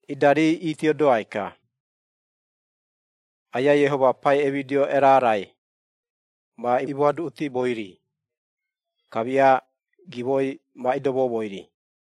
Ida rii itiodoai-ka, Aiai Iehoma pai emidio erarai ma imoaduꞌutimoi-ri, kamia gimoi ma idomoumoi-ri.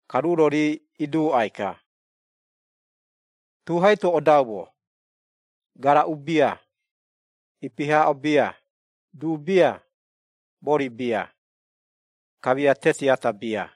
Ka ruu-ro rii iduuꞌai-ka, “Tu hai-to odaumo, garaꞌu bia, ipi haaꞌo bia, du bia, mori bia, kamia teti ata bia.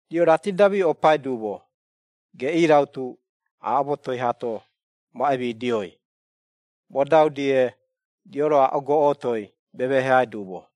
Riꞌo raati-da miꞌopai duumo, geꞌii rautu aaꞌo motoi haato ma emidioi, modau-die, riꞌo-ro aaꞌo goꞌotoi memeheai duumo.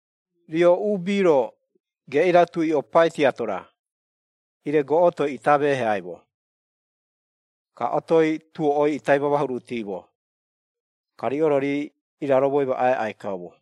Riꞌo uubi-ro, geꞌii rautu iꞌopai tiato-ra, ire goꞌotoi ita emeheaimo, ka otoi tuoꞌoi ita imamahuruutiimo. Ka riꞌo-ro, rii iraromo imaꞌai aꞌai kaumo.”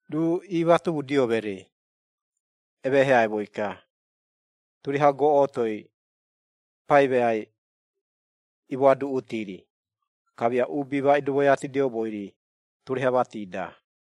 Ruu iimatomudio mereei emeheaimoi-ka, turiaha goꞌotoi pai meai imoaduꞌuti-ri, kamia uubi ma idomoiatidioumoi-ri, turiaha mati-da.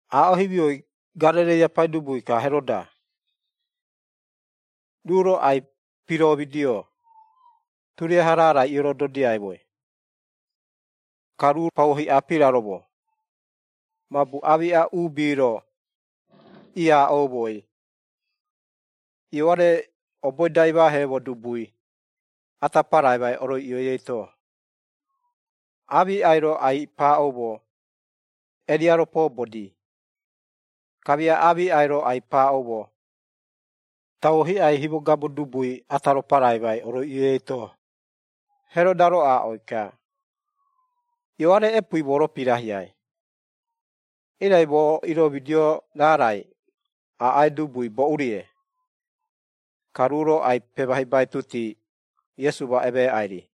Aaꞌo himioi Garereia paidubui-ka Heroda, ruu-ro ai-piroomidio, turiaha raarai iorododiaimoi. Ka ruu pauo hiꞌa piraromo, mabu aamiꞌa uubi-ro iaaꞌoumoi, Ioare oboi-da imaaheemo dubui, ata paraimai oroiꞌioi eito. Aamiꞌai-ro ai-paaꞌoumo, Eria-ro poobodii, kamia aamiꞌai-ro ai-paaꞌoumo, tauo hiꞌai himogabo dubui ata-ro paraimai oroiꞌioi eito. Heroda-ro aaꞌoi-ka, “Ioare epuui moo-ro pirahiai, irai moo iroomidio raarai, aꞌai dubui boꞌu-rie?” Ka ruu-ro ai-pemahibaituti, Iesu ma emeeꞌai-ri.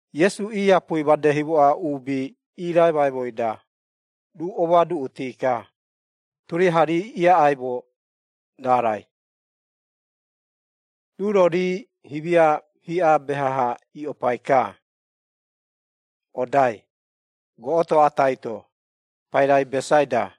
Iesu iiapui made himoꞌa uubi iiraimaimoi-da, ruu omoaduꞌuti-ka, turiaha rii iaꞌaimo raarai. Ruu-ro, rii himia hiꞌa beha-ha iꞌopai-ka odai, goꞌoto atai-to, pairai Besaida.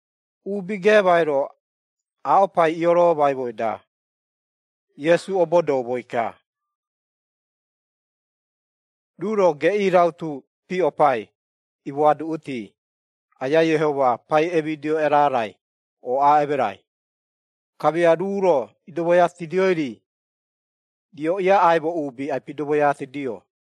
Uubi geemai-ro aaꞌo pai ioroomaimoi-da, Iesu obodoumoi-ka. Ruu-ro, geꞌii rautu piꞌopai imoaduꞌuti, Aiai Iehoma pai emidio erarai ooꞌaa emerai, kamia ruu-ro idomoiatidioi-ri, rio iaꞌaimo uubi ai-pidomoiatidio.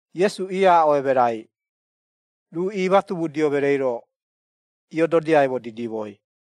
Iesu iaaꞌo emerai, ruu iimatomudio mereei-ro iododiaimo didimoi,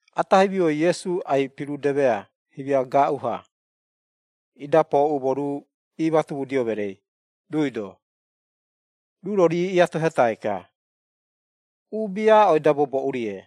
Ata himioi Iesu ai-pirudemea himia gaaꞌu-ha, ida pooꞌumo ruu iimatomudio mereei, ruui-do. Ruu-ro rii iatohetai-ka, “Uubi aaꞌoi-da, moo boꞌu-rie?”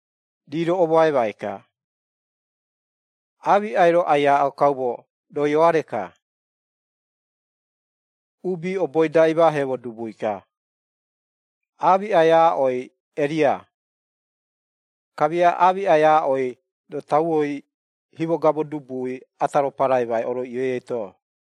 Rii-ro omoaimai-ka, “Aamiꞌai-ro ai-aaꞌo kaumo, roo Ioare-ka, uubi oboi-da, imaaheemo dubui-ka, aamiꞌai aaꞌoi Eria, kamia aamiꞌai aaꞌoi roo tauoi himogabo dubui ata-ro paraimai oroiꞌioi eito.”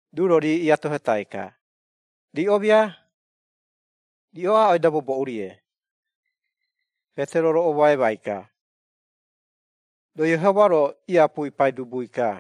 Ruu-ro rii iatohetai-ka, “Riꞌo mia? Riꞌo aaꞌoi-da, moo boꞌu-rie?” Petero-ro omoaimai-ka, “Roo Iehoma-ro iapui Paidubui-ka.”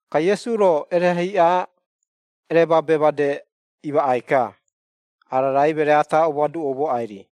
Ka Iesu-ro erehe hiꞌa ereemaabe made imaꞌai-ka, ara raai meree ata omoaduꞌoumoꞌai-ri.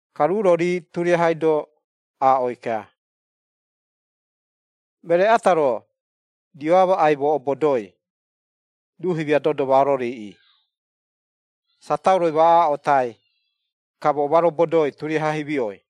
Ka ruu-ro, rii turiahai-do aaꞌoi-ka, “Meree ata-ro, rio amaꞌai moo obodoi, ruu himia dodo ma ororiiꞌii, satauroi ma aaꞌotai, ka moo ma robodoi turiaha himioi.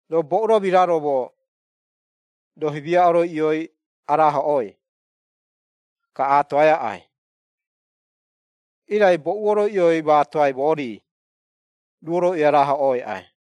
Roo boꞌu-ro miraromo, roo himia oroiꞌioi araahoꞌoi, ka aatoai aꞌai, irai boꞌu oroiꞌioi maatoai moo-ri, ruu oroiꞌioi arahoꞌoi aꞌai.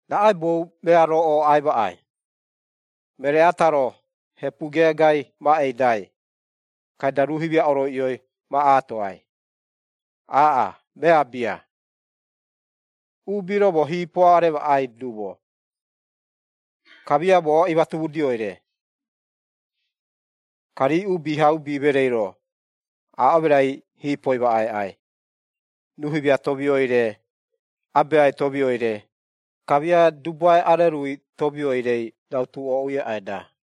Raꞌaibou mea-ro ooꞌai maꞌai, meree ata-ro hepu geegai ma eidai, kaida, ruu himia oroiꞌioi ma aatoai? Aaꞌa, mea bia! Uubi-ro moo hiipo aremaꞌai duumo, kamia moo imatomudioi-re, ka rii Uubihaubi mereei-ro, aaꞌo emerai hiipo imaꞌai aꞌai, ruu himia tomioi-re, Abeai tomioi-re, kamia dubuae arerui tomioi-rei, rautu ooꞌui aꞌai-da.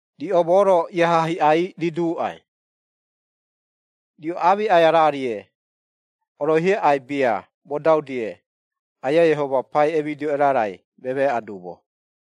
Riꞌo moo-ro iaha hiꞌai riduuꞌai, riꞌo aamiꞌai araarie, oroihi aꞌai bia modau-die, Aiai Iehoma pai emidio erarai, memeeꞌa duumo.”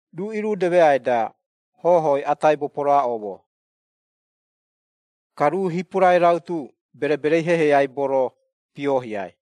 Ruu irudemeai-da, hohoi ata aibo poroaꞌoomo, ka ruu hipurai rautu bereberei hehei aibo-ro pioohiai.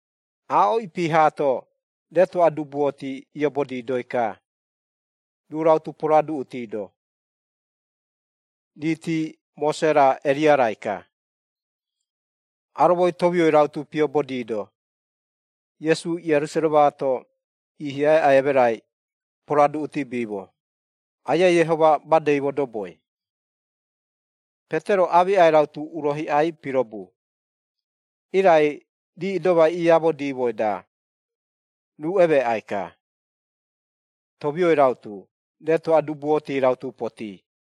Aaꞌo ipi haato, retoꞌa dubuoti iobodidoi-ka, ruu rautu poroaduꞌutido, riiti Mose-ra, Eria-raika. Aromoi tomioi rautu piobodiido, Iesu Ierusaremaato iihiai aꞌai emerai poroaduꞌutibiimo, Aiai Iehoma madei modoboi. Petero aamiꞌai rautu uro hiꞌai pirobu, irai rii idomai iiaamodiimoi-da, ruu emeeꞌai-ka, tomioi rautu, retoꞌa dubuoti rautu potii.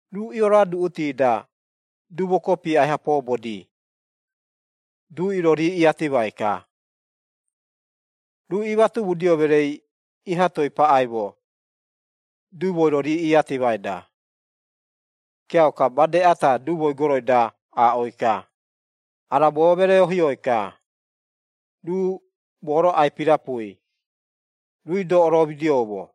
Ruu ioroaduꞌuti-da dumo kopi aiha poobodi, duꞌi-ro rii iatimai-ka, ruu iimatomudio mereei iha toei paꞌaimo dumoi-ro rii iiatimai-da. Kiauka made ata dumoi goroi-da aaꞌoi-ka, “Ara moo meree-ohioi-ka, ruu moo-ro ai-pirapui, ruui-do oromidioumo.”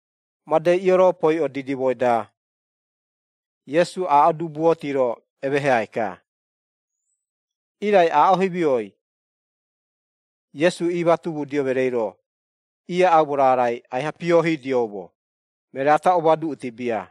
Madei ioropoiꞌo didimoi-da, Iesu aaꞌo dubuoti-ro emeheai-ka. Irai aaꞌo himioi, Iesu iimatomudio mereei-ro, iaꞌaumo raarai aiha piohiidioumo, meree ata omoaduꞌuti bia.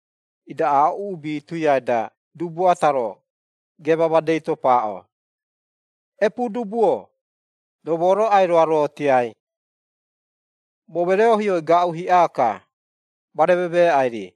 Ida aaꞌo uubi tuiai-da, dubu ata-ro, geema madei-to paaꞌo, “Epuudubu-o! Roo moo-ro ai-roarotiai, moo meree-ohioi, gaaꞌu hiꞌa-ka, ma rememeeꞌai-ri.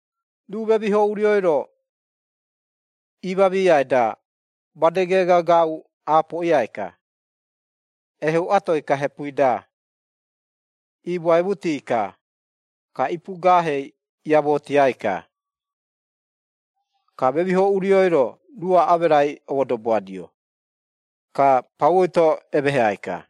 Ruu memiho urioi-ro iimamiiai-da, made geega gaaꞌu aapoꞌiai-ka, eheuꞌatoi-ka hepui-da, iimoaimuti-ka, ka ipuugaahei iamootiai-ka. Ka memiho urioi-ro, ruu aaꞌo emerai omodoboadio, ka pauoi-to emeheai-ka.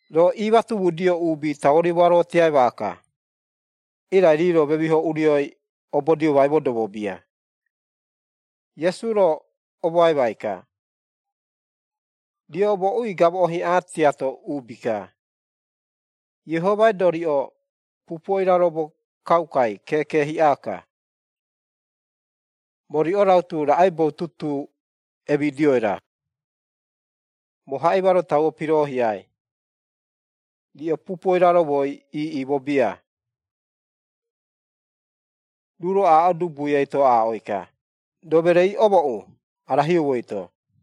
Roo iimatomudio uubi tauo rimoarotiai maaka, irai rii-ro memiho urioi omobodiomai modobo bia.” Iesu-ro omoaimai-ka, “Riꞌo moꞌui gamoꞌo hiꞌa tiato uubi-ka, Iehomai-do riꞌo pupuo iraromo kaukai, keeke hiꞌa-ka. Moo riꞌo rautu, raꞌaibou tutuu emidioi-ra? Moo haꞌima-ro tauo piroohiai, riꞌo pupuo iraromoi iiꞌimo bia.” Ruu-ro aaꞌo dubui eito aaꞌoi-ka, “Roo mereei omooꞌu, ara hiou eito.”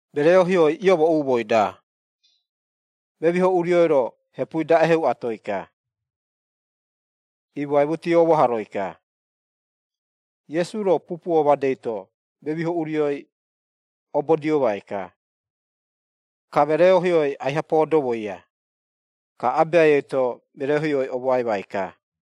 Meree-ohioi iomooꞌumoi-da, memiho urioi-ro, hepui-da eheuꞌatoi-ka, iimoaimutii oomahoroi-ka. Iesu-ro pupuo madei-to memiho urioi obodiomai-ka, ka meree-ohioi aiha poodomoia, ka abeai eito meree-ohioi omoaimai-ka.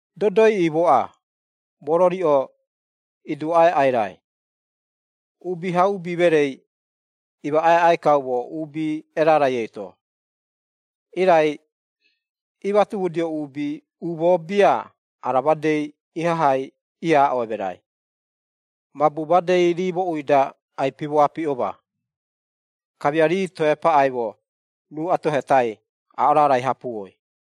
“Dodo iiꞌimoꞌa moo-ro riꞌo iduuꞌai aꞌai raai! Uubihaubi mereei imaꞌai aꞌai kaumo, uubi erarai eito.” Irai iimatomudio uubi umoo bia ara madei ihahai iaaꞌo emerai, mabu madei rii moꞌui-da ai-pimoapiꞌoma, kamia rii toe paꞌaimo ruu atohetai aaꞌo raarai hapuoi.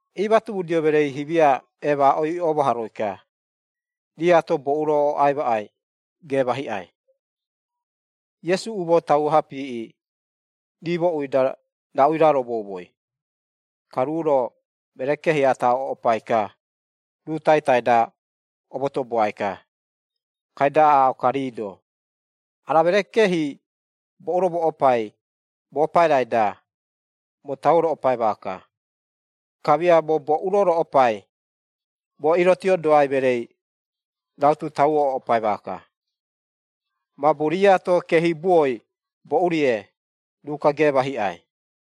Iimatomudio mereei himia eemaaꞌoi oomahoroi-ka, riiato, boꞌu-ro ooꞌai maꞌai geema hiꞌai. Iesu umoo tauo-ha piiꞌi, rii moꞌui-da raꞌu iraromoumoi, ka ruu-ro, meree-keehi ata oꞌopai-ka, ruu taitai-da omotoboai-ka, kaida aaꞌo-ka rii-do, “Ara meree-keehi boꞌu-ro moꞌopai, moo pairai-da, moo tauo roꞌopai maaka, kamia moo boꞌu-ro roꞌopai, moo irotiodoai mereei rautu tauo oꞌopai maaka. Mabu riꞌoato keehibuoi boꞌu-rie, ruu-ka geema hiꞌai.”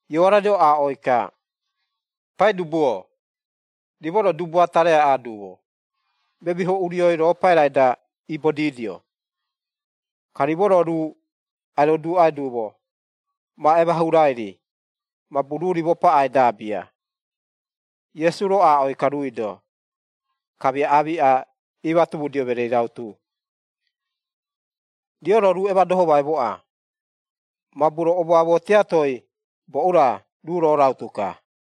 Ioare-ro aaꞌoi-ka, “Paidubu-o, rimo-ro dubu ata reaꞌaa duumo, memiho urioi, roo pairai-da ibodiidio. Ka rimo-ro ruu ai-roduuꞌai duumo ma emahuurai-ri, mabu ruu rimo paꞌai-da bia.” Iesu-ro aaꞌoi-ka ruui-do, kamia aamiꞌa iimatomudio mereei rautu, “Riꞌo-ro ruu emadohomaimoꞌa, mabu roo omoamoo tiatoi boꞌu-ra, ruu roo rautu-ka.”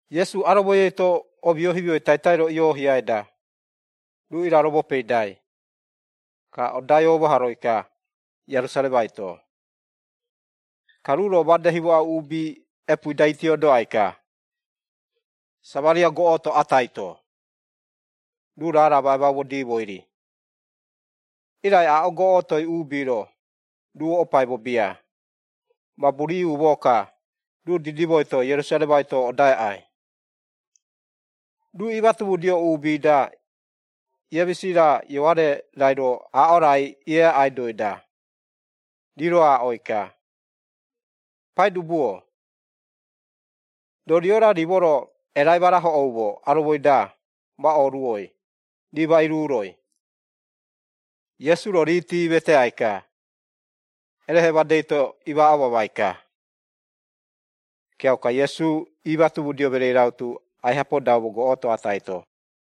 Iesu aromoi eito omio himioi taitai-ro ioohiai-da, ruu iraromo peidai, ka odai omahoroi-ka Ierusaremai-to. Ka ruu-ro made himoꞌa uubi epuui-da itiodoai-ka, Samaria goꞌoto atai-to, ruu raara ma emaumodiimoi-ri. Irai aaꞌo goꞌotoi uubi-ro, ruu oꞌopaimo bia, mabu rii umoo-ka, ruu didimoi-to Ierusaremai-to odai aꞌai. Ruu iimatomudio uubi-da, Iemisi-ra Ioare-rairo aaꞌo raai ieaꞌaidoi-da, rii-ro aaꞌoi-ka, “Paidubu-o, roo rio-ra rimo-ro erai ma rahoꞌoumo aromoi-da, ma ooruoi, rii ma iruuroi?” Iesu-ro riiti iimeteai-ka, erehe madei-to imaaꞌo mamai-ka. Kiauka Iesu iimatomudio mereei rautu, aiha podaumo goꞌoto atai-to.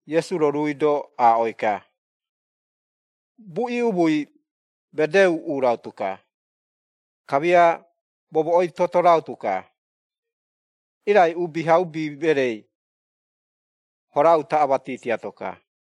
Iesu-ro ruui-do aaꞌoi-ka, “Buꞌi umui medee uuꞌu rautu-ka. Kamia momoꞌoi toto rautu-ka, irai Uubihaubi mereei hora utaꞌa mati tiato-ka.”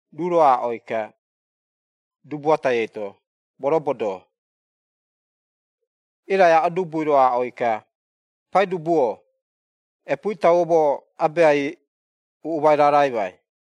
Ruu-ro aaꞌoi-ka, dubu atai eito, “Moo robodoo.” Irai aaꞌo dubui-ro aaꞌoi-ka, “Paidubu-o, epuui tauo, moo abeai uuꞌumai raaraimai.”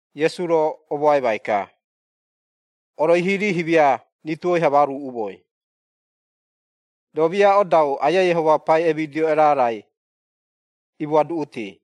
Iesu-ro omoaimai-ka, “Oroihi rii himia rituoi-ha ma oruuꞌumoi. Roo-mia odau Aiai Iehoma pai emidio erarai imoaduꞌuti.”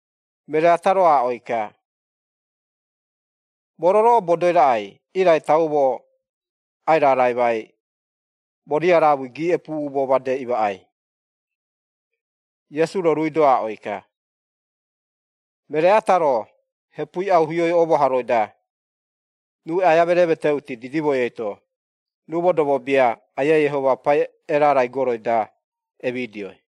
Meree ata-ro aaꞌoi-ka, “Moo-ro roo obodoi raꞌai, irai tauo moo ai-raraimai, moo riaraamui giiꞌepu-umoo made imaꞌai.” Iesu-ro, ruui-do aaꞌoi-ka, “Meree ata-ro, hepui auhioi oomahoroi-da, ruu aia mereemeteuti didimoi eito, ruu modobo bia, Aiai Iehoma pai erarai goroi-da emidioi.”